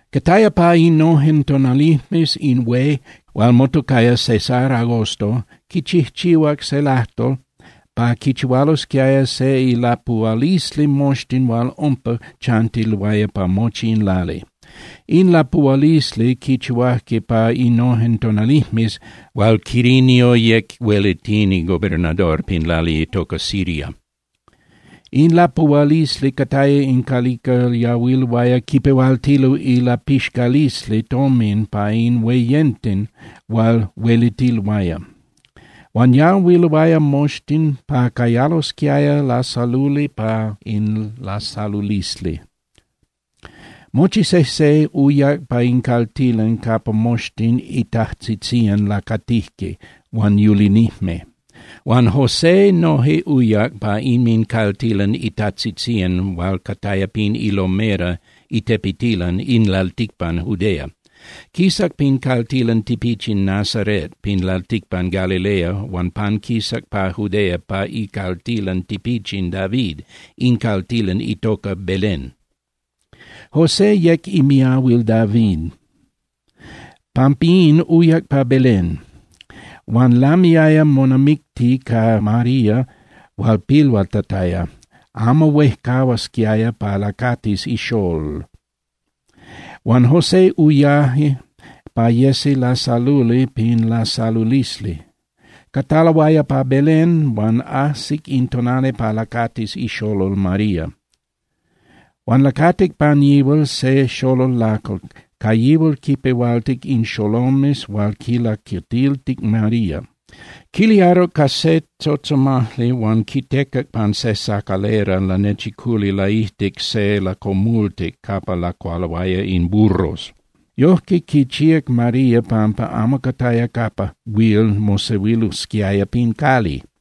Cataya pa innojen tonalijmes in hué niman hué hual motocaya César Agosto quichijchihuac se lajtol pa quichihualosquiaya se ilapuhualisli moxtin hual umpa chantiloaya pa mochi in lali. In lapuhualisli quichihuajque pa innojen tonalijmes hual Quirinio yec huelitini (gobernador) pin lali itoca Siria. In lapuhualisli cataya in calica yahuiloaya quipehualtilo ilapixcalisli tomin pa in hueyenten hual huelitiloaya. Huan yahuiloaya moxtin pa cayalosquiaya lasaluli pa in lasalulisli. Mochi sejse uyac pa in caltilan capa moxtin itajtzitzían lacatijque huan yulinijme. Huan José noje uyac pa inmincaltilan itajtzitzían hual cataya pin ilomera (itepetilan) in lalticpan Judea. Quisac pin caltilan tipichin Nazaret pin lalticpan Galilea, huan panquisac pa Judea pa icaltilan tipichin David, in caltilan itoca Belén. José yec imiahuil David, pampín uyac pa Belén. Huan lamiaya monamicti ca María hual pilhuatataya, amo huejcahuasquiaya pa lacatis ixolol. Huan José uyaje pa yesi lasaluli pin lasalulisli. Cataloaya pa Belén, huan ajsic in tonali pa lacatis ixolol María. Huan lacatic pan yihual se xolol lacal, ca yihual quipehualtic in xolomes hual quilacatiltic María. Quiliaruc ca se tzotzomajli huan quitecac pan se sacalera lanechiculi laijtic se lacomultic capa lacualoaya in burros. Yojque quichíac María pampa amo cataya capa huil mosehuilosquiaya pin cali.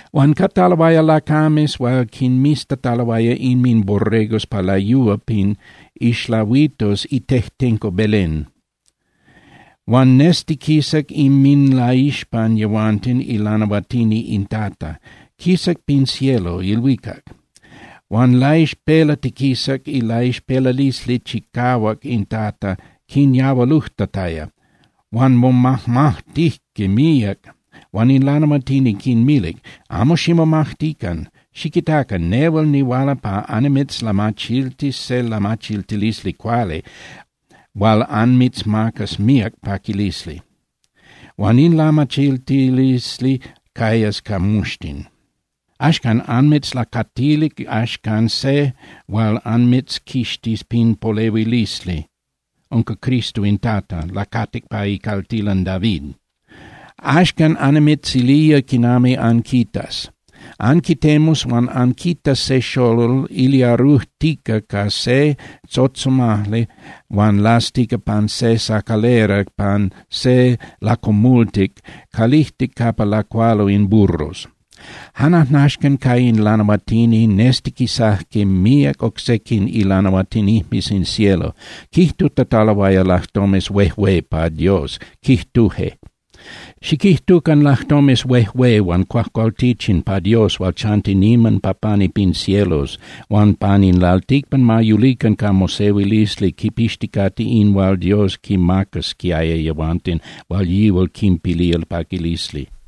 Huan cataloaya lacames hual quinmiztataloaya inminborregos pa layúa pin ixlahuitos itejtenco Belén. Huan nestiquisac inminlaixpan yehuanten ilanahuatini in Tata, quisac pin cielo (ilhuicac). Huan laixpelatiquisac ilaixpelalisli chicahuac in Tata quinyahualujtataya, huan momajmajtijque míac. Huan in lanahuatini quinmilic: —Amo ximomajtican. Xiquitacan, nehual nihuala pa annimitzlamachiltis se lamachiltilisli cuali hual anmitzmacas míac paquilisli, huan in lamachiltilisli cayas pa moxtin. Axcan anmitzlacatilic axcan se hual anmitzquixtis pin polehuilisli. Unca CRISTO in Tata, lacatic pa icaltilan David. Axcan annimitzilía quinami anquitas. Anquitemus huan anquitas se xolol iliarujtica ca se tzotzomajli huan lastica pan se sacalera pan se lacomultic calijtic capa lacualo in burros. Jan ajnaxcan ca in lanahuatini nestiquisajque míac oc sequin ilanahuatinijmes in cielo, quijtutataloaya lajtomes huejué pa Dios, quijtuje: ¡Xiquijtucan lajtomes huejué huan cuajcualtichin pa Dios hual chanti niman pa pani pin cielos, huan pan in lalticpan ma yulican ca mosehuilisli quipixticate in hual Dios quinmacasquiaya yehuanten hual yihual quinpilía paquilisli!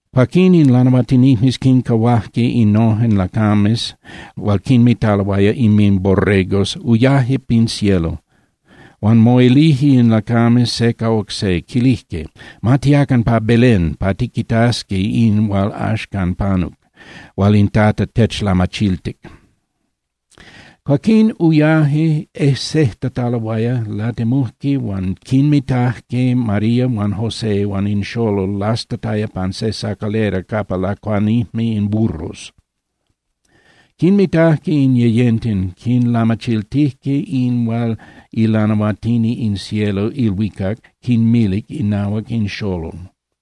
Cuaquín in lanahuatinijmes quincahuajque innojen lacames hual quinmitaloaya inminborregos, uyaje pin cielo. Huan moilijque in lacames se ca oc se, quilijque: —Ma tiacan pa Belén pa tiquitasqui in hual axcan panuc, hual in Tata techlamachiltic. Cuaquín uyaje ejsejtataloaya, latemujque huan quinmitajque María huan José huan in xolol lastataya pan se sacalera capa lacuanijme in burros. Quinmitajque in yeyenten, quinlamachiltijque in hual ilanahuatini in cielo (ilhuicac) quinmilic inahuac in xolol.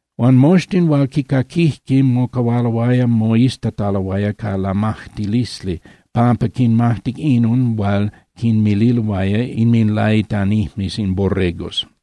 Huan moxtin hual quicaquijque, mocahualoaya moiztataloaya ca lamajtilisli pampa quinmajtic inon hual quinmililoaya inminlaitanijmes in borregos.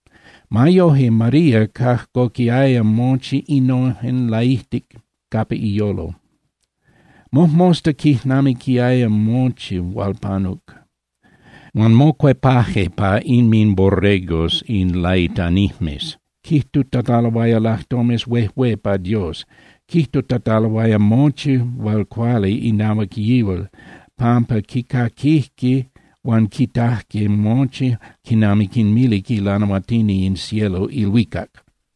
Ma yoje, María cajcoquiaya mochi innojen laijtic capa iyolo, mojmosta quijnamiquiaya mochi hual panuc. Huan mocuepaje pa inminborregos in laitanijmes quijtutataloaya lajtomes huejué pa Dios. Quijtutataloaya mochi hual cuali inahuac yihual, pampa quicaquijque huan quitajque mochi jan quinami quinmilic ilanahuatini in cielo (ilhuicac).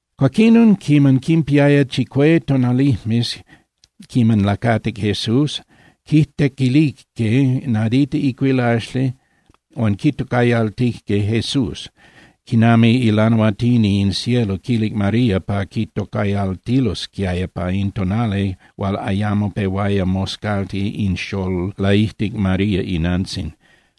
Cuaquinon, quiman quinpiaya chicue tonalijmes quiman lacatic Jesús, quitequilijque nadita icuilaxli huan quitocayaltijque JESÚS, quinami ilanahuatini in cielo quilic María pa quitocayaltilosquiaya pa in tonali hual ayamo pehuaya moscalti in xolol laijtic María inantzin.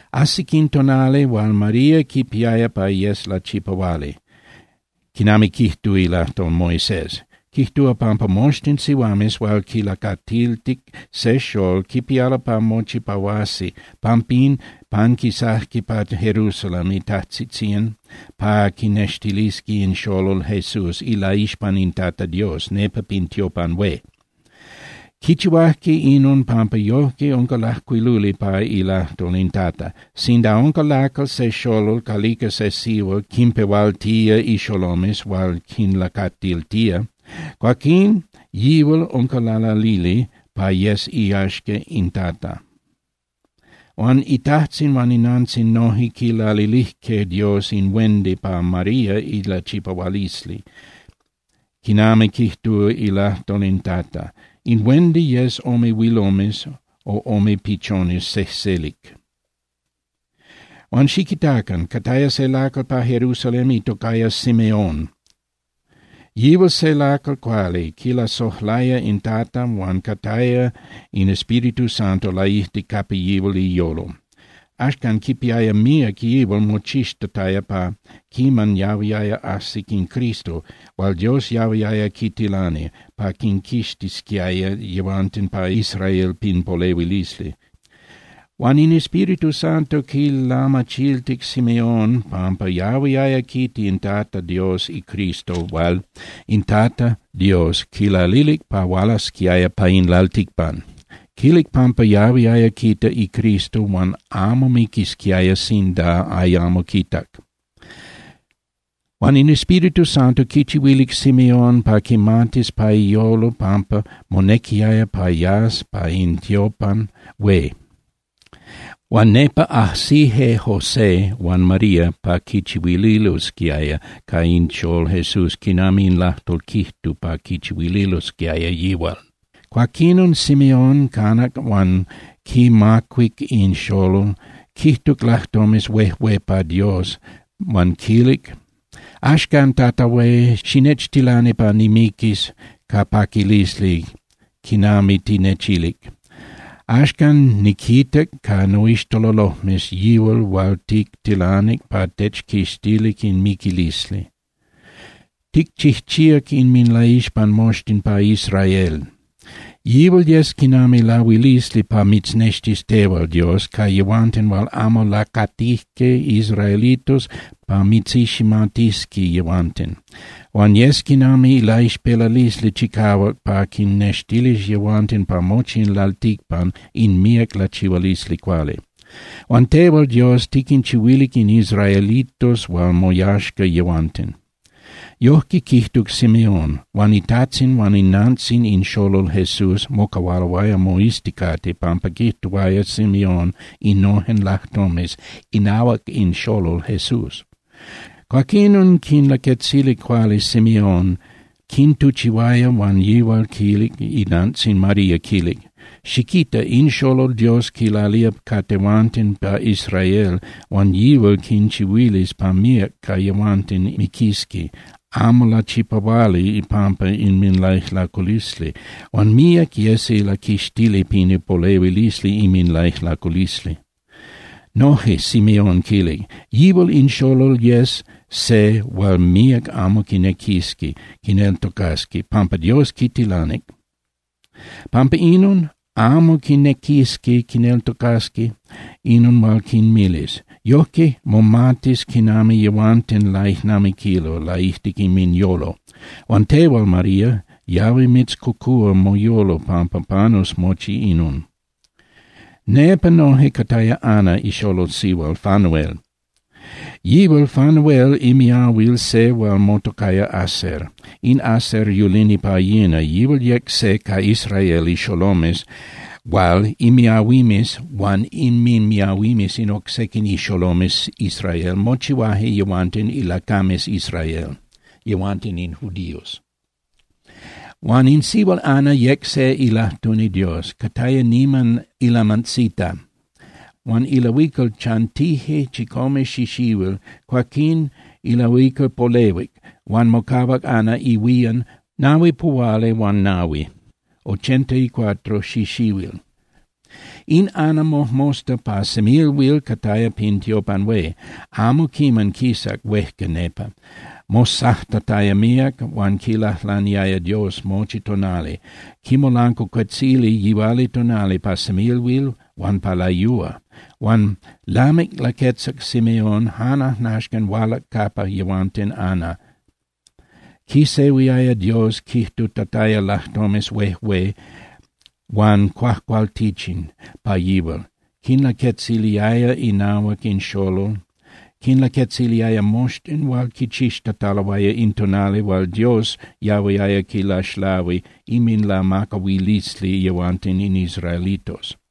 Ajsic in tonali hual María quipiaya pa yes lachipahuali, quinami quijtúa ilajtol Moisés: Quijtúa pampa moxtin sihuames hual quilacatiltic se xolol quipialo pa mochipahuasi. Pampín, panquisajque pa Jerusalén itajtzitzían pa quinextilisqui in xolol Jesús ilaixpan in Tata Dios nepa pin tiopan hué. Quichihuajque inon pampa yojque unca lajcuiluli pa ilajtol in Tata: “Sinda unca lacal se xolol calica se sihual quinpehualtía ixolomes hual quinlacatiltía, cuaquín yihual unca lalalili pa yes iyaxca in Tata.” Huan itajtzin huan inantzin noje quilalilijque Dios in huendi pa María ilachipahualisli, quinami quijtúa ilajtol in Tata: In huendi yes ome huilomes o ome pichones sejselic. Huan xiquitacan. Cataya se lacal pa Jerusalén itocaya Simeón, yihual se lacal cuali, quilasojlaya in Tata huan cataya in Espíritu Santo laijtic capa yihual iyolo. Axcan quipiaya míac yihual mochixtataya pa quiman yahuiaya ajsi in Cristo hual Dios yahuiaya quitilani pa quinquixtisquiaya yehuanten pa Israel pin polehuilisli. Huan in Espíritu Santo quilamachiltic Simeón pampa yahuiaya quita in Tata Dios iCristo hual in Tata Dios quilalilic pa hualasquiaya pa in lalticpan. Quilic pampa yahuiaya quita iCristo huan amo miquisquiaya sinda ayamo quitac. Huan in Espíritu Santo quichihuilic Simeón pa quimatis pa iyolo pampa monequiaya pa yas pa in tiopan hué. Huan nepa ajsije José huan María pa quichihuililosquiaya ca in xolol Jesús quinami in lajtol quijtuc pa quichihuililosquiaya yihual. Cuaquinon Simeón canac huan quimacuic in xolol, quijtuc lajtomes huejué pa Dios huan quilic: Axcan, Tata Hué, xinechtilani pa nimiquis ca paquilisli quinami tinechilic. Axcan niquitac ca noixtololojmes yihual hual tictilanic pa techquixtilis in miquilisli. Ticchijchíac inminlaixpan moxtin pa Israel. Yihual yes quinami lahuilisli pa mitznextis tehual, Dios, ca yehuanten hual amo lacatijque israelitos, pa mitziximatisqui yehuanten. Huan yes quinami laixpelalisli chicahuac pa quinnextilis yehuanten pa mochi in lalticpan in míac lachihualisli cuali, hual tehual, Dios, tiquinchihuilic in israelitos hual moyaxca yehuanten. Yojque quijtuc Simeón. Huan itajtzin huan inantzin in xolol Jesús mocahualoaya moizticate pampa quijtuaya Simeón innojen lajtomes inahuac in xolol Jesús. Cuaquinon quinlaquetzilic cuali Simeón, quintuchihuaya, huan yihual quilic inantzin María, quilic: —Xiquita. In xolol Dios quilalía ca tehuanten pa Israel huan yihual quinchihuilis pa míac ca yehuanten miquisqui amo lachipahuali ipampa inminlaijlaculisli, huan míac yesi laquixtili pin ipolehuilisli inminlaijlaculisli. Noje Simeón quilic: —Yihual in xolol yes se hual míac amo quinequisqui quineltocasqui pampa Dios quitilanic. Pampa inon, amo quinequisqui quineltocasqui inon hual quinmilis. Yojque momatis quinami yehuanten laijnamiquilo laijtic inminyolo. Huan tehual, María, yahui mitzcocúa moyolo pampa panus mochi inon. Nepa noje cataya Ana, ixolol sihual Fanuel. Yihual Fanuel imiahuil se hual motocaya Aser. In Aser yulini pa yina, yihual yec se ca Israel ixolomes hual imiahuimes huan inminmiahuimes in oc sequin ixolomes Israel mochihuaje yehuanten ilacames Israel, yehuanten in judíos. Huan in sihual Ana yec se ilajtuni Dios, cataya niman ilamantzita. Huan ilahuical chantije chicome xixihuil, cuaquín ilahuical polehuic. Huan mocahuac Ana ihuían pa nahuipuhualihuanahui (ochentaicuatro) xixihuil. In Ana mojmosta pa semilhuil cataya pin tiopan hué, amo quiman quisac huejca nepa, mosajtataya míac huan quilajlaniaya Dios mochi tonali, quimolancuacuetzilic yihualitonali, pa semilhuil huan pa layúa. Huan lamic laquetzac Simeón, jan ajnaxcan hualac capa yehuanten Ana, quisehuiaya Dios quijtutataya lajtomes huejué huan cuajcualtichin pa yihual, quinlaquetziliaya inahuac in xolol, quinlaquetziliaya moxtin hual quichixtataloaya in tonali hual Dios yahuiaya quilaxlahui inminlamacahualisli yehuanten in israelitos.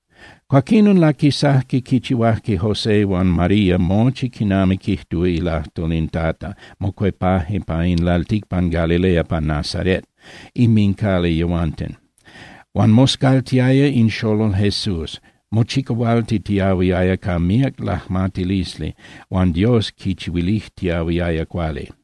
Cuaquinon laquisajque quichihuajque José huan María mochi quinami quijtúa ilajtol in Tata, mocuepaje pa in lalticpan Galilea pa Nazaret inmincali yehuanten. Huan moscaltiaya in xolol Jesús, mochicahualtitiahuiaya ca míac lajmatilisli huan Dios quichihuilijtiahuiaya cuali.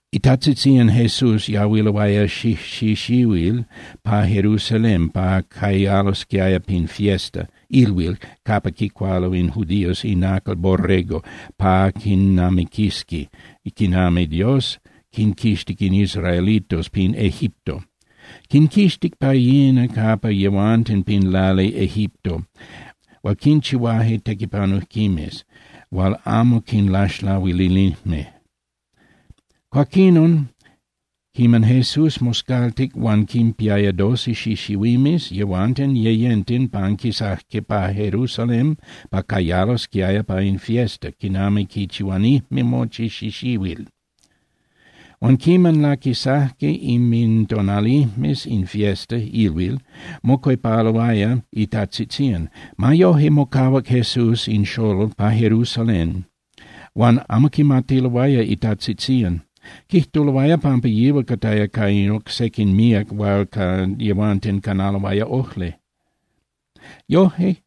Itajtzitzían Jesús yahuiloaya xijxixihuil pa Jerusalén pa cayalosquiaya pin fiesta (ilhuil) capa quicualo in judíos inacal borrego pa quijnamiquisqui quinami Dios quinquixtic in israelitos pin Egipto. Quinquixtic pa yina capa yehuanten pin lali Egipto hual quinchihuaje tequipanujquimes hual amo quinlaxlahuilinijme. Cuaquinon, quiman Jesús moscaltic huan quinpiaya doce xixihuimes, yehuanten yeyenten panquisajque pa Jerusalén pa cayalosquiaya pa in fiesta, quinami quichihuanijme mochi xixihuil. Huan quiman laquisajque inmintonalijmes in fiesta (ilhuil), mocuepaloaya itajtzitzían. Ma yoje, mocahuac Jesús in xolol pa Jerusalén, huan amo quimatiloaya itajtzitzían. Quijtuloaya pampa yihual cataya ca in oc sequin míac hualca yehuanten canaloaya ojli. Yoje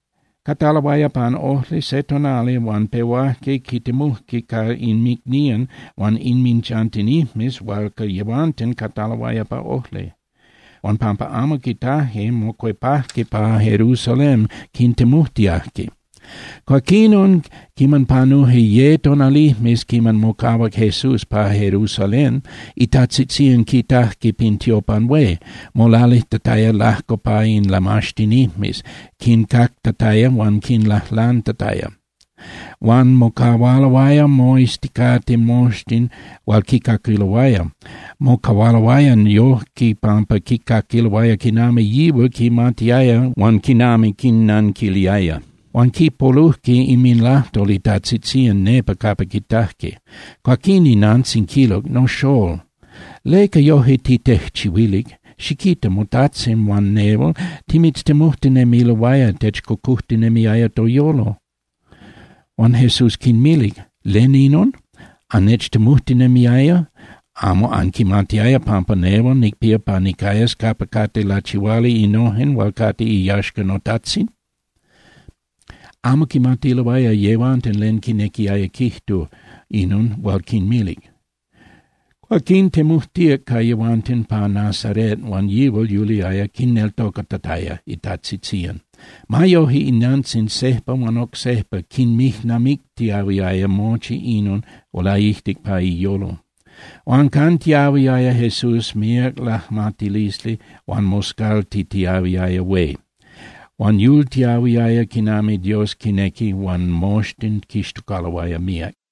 cataloaya pan ojli se tonali huan pehuajque quitemujque ca inmicnían huan inminchantinijmes hualca yehuanten cataloaya pa ojli. Huan pampa amo quitajque, mocuepajque pa Jerusalén quitemujtiajque. Cuaquinon, quiman panuje ye tonalijmes quiman mocahuac Jesús pa Jerusalén, itajtzitzían quitajque pin tiopan hué, molalijtataya lajco pa in lamaxtinijmes, quincactataya huan quinlajlantataya. Huan mocahualoaya moizticate moxtin hual quicaquiloaya, mocahualoaya yoje pampa quicaquiloaya quinami yihual quimatiaya huan quinami quinnanquiliaya. Huan quipolujque inminlajtol itajtzitzían nepa capa quitajque. Cuaquín inantzin quilic: —Noxól, ¿leca yoje titejchihuilic? Xiquita. Motajtzin huan nehual timitztemujtinemiloaya, techcocojtinemiaya toyolo. Huan Jesús quinmilic: —¿Len inon? ¿Annechtemujtinemiaya? ¿Amo anquimatiaya pampa nehual nicpía pa nicayas capa cate lachihuali innojen hual cate iyaxca noTajtzin? Amo quimatiloaya yehuanten len quinequiaya quijtu inon hual quinmilic. Cuaquín temujtíac ca yehuanten pa Nazaret huan yihual yuliaya quinneltocatataya itajtzitzían. Ma yoje, inantzin sejpa huan oc sejpa quinmijnamictiahuiaya mochi innojen laijtic pa iyolo. Huan cantiyahuiaya Jesús míac lajmatilisli huan moscaltitiyahuiaya hué. Huan yultiahuiaya quinami Dios quinequi huan moxtin quixtocaloaya míac.